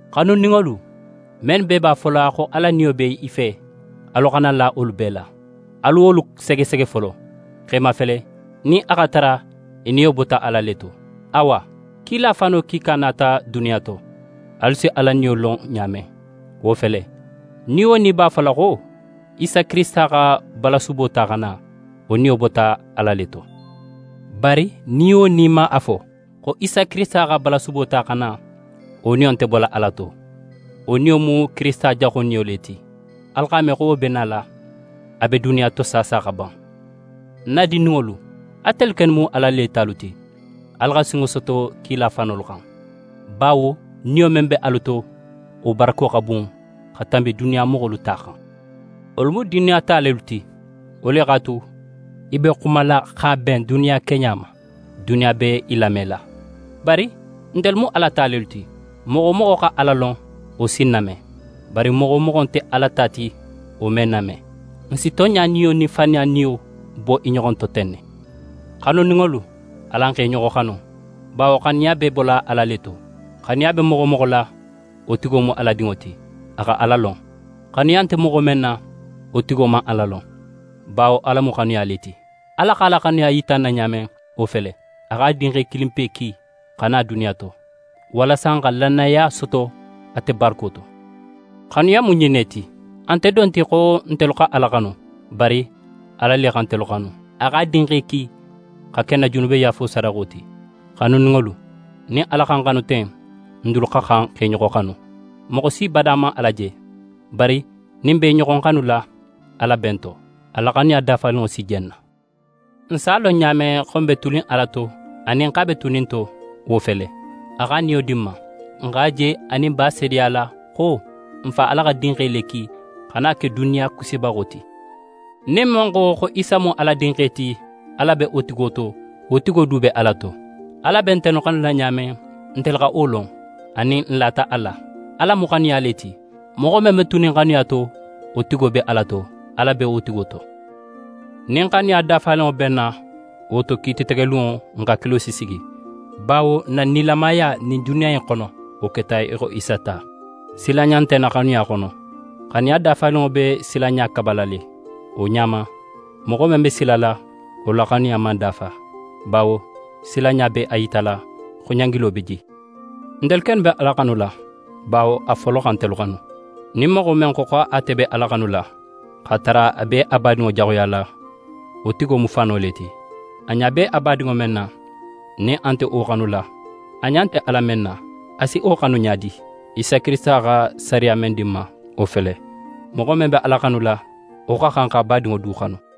Xanuninŋolu, mennu bee b'a fola xo Ala Niyo be i fe, alu xana la wolu bee la. Alu wolu segesege folo, x'e mafele nin a x'a tara i niyo bota Ala le to. Awa, kila fano kiika nata duniya to. Alu si Ala Niyo lon ɲa men, wo fele: Ni wo ni b'a fola xo Isa Kirisita xa balasubo ta xa na, wo niyo bota Ala le to. Bari ni wo ni man a fo xo Isa Kirisita xa balasubo ta xa na, wo niyo nte bola Ala to. Wo niyo mu Kirisita Jaxo niyo le ti. Alu x'a me xo wo be nala, a be duniya to saasa xa ban. Ń na dindinŋolu, atelu kennu mu Ala ta lelu ti. Alu xa sinŋo soto kila fanolu xan, bawo niyo men be alu to, wo barako xa bun xa tanbi duniya moxolu ta xan. Wolu mu duniya ta lelu ti, wo le x'a tu, i be xumala x'a ben duniya keɲa ma, duniya be i lamela. Bari ntelu mu Ala ta lelu ti. Moxo wo moxo xa Ala lon, wo si n name, bari moxo wo moxo nte Ala ta ti, wo me n name. N si tonɲa Niyo nin faniya niyo bo i ɲoxo to ten ne. Xanuninŋolu, alan x'e ɲoxo xanu, bawo xanuya be bola Ala le to. Xanuya be moxo wo moxo la, wo tigo mu Ala dinŋo ti, a xa Ala lon. Xanuya nte moxo men na, wo tigo man Ala lon, bawo Ala mu xanuya le ti. Ala x'a la xanuya yita n na ɲa men, wo fele: A x'a Dinxe kilinpe ki xa na duniya to, walasa n xa nilamaya soto ate barako to. Xanuya mu ɲin ne ti: A nte don ti xo ntelu xa Ala xanu, bari Ala le xa ntelu xanu, a x'a Dinxe ki x'a ke n na junubeyaafo sadaxo ti. Xanuninŋolu, nin Ala xa n xanu ten, n dulu xa xan x'e ɲoxo xanu. Moxo si bada man Ala je, bari nin n be i ɲoxo xanula, Ala be n to. A la xanuya dafaninŋo si je n na. N s'a lon ɲa men xo n be tunin Ala to anin x'a be tunin n to, wo fele: A x'a Niyo di n ma. N x'a je anin n b'a seedeyala xo n Fa Ala x'a Dinxe le ki xa na ke duniya Kisibaxo ti. Nin men xo, xo Isa mu Ala Dinxe ti, Ala be wo tigo to, wo tigo du be Ala to. Ala be ntelu xanula ɲa men, ntelu xa wo lon, anin n lata a la. Ala mu xanuya le ti. Moxo men be tunin xanuya to, wo tigo be Ala to, Ala be wo tigo to. Nin xanuya dafaninŋo be n na, wo to, kiito tegelunŋo n hakilo si sigi, bawo n na nilamaya ɲin duniya in xono, wo keta í xo Isa ta. Silanɲa nte xanuya xono. Xanuya dafaninŋo be silanɲa kabala le. Wo ɲa ma, moxo men be silala, wo la xanuya man dafa, bawo silanɲa be a yitala xo ɲangilo be je. Ntelu kennu be Ala xanula, bawo a folo xa ntelu xanu. Nin moxo men xo xo ate be Ala xanula, x'a tara a be a badinŋo jaxuyala, wo tigo mu fano le ti. A ɲa be a badinŋo men na, nin a nte wo xanula, a ɲa nte Ala men na, a si wo xanu ɲa di? Isa Kirisita xa sariya men di n ma, wo fele: Moxo men be Ala xanula, wo xa xan x'a badinŋo du xanu.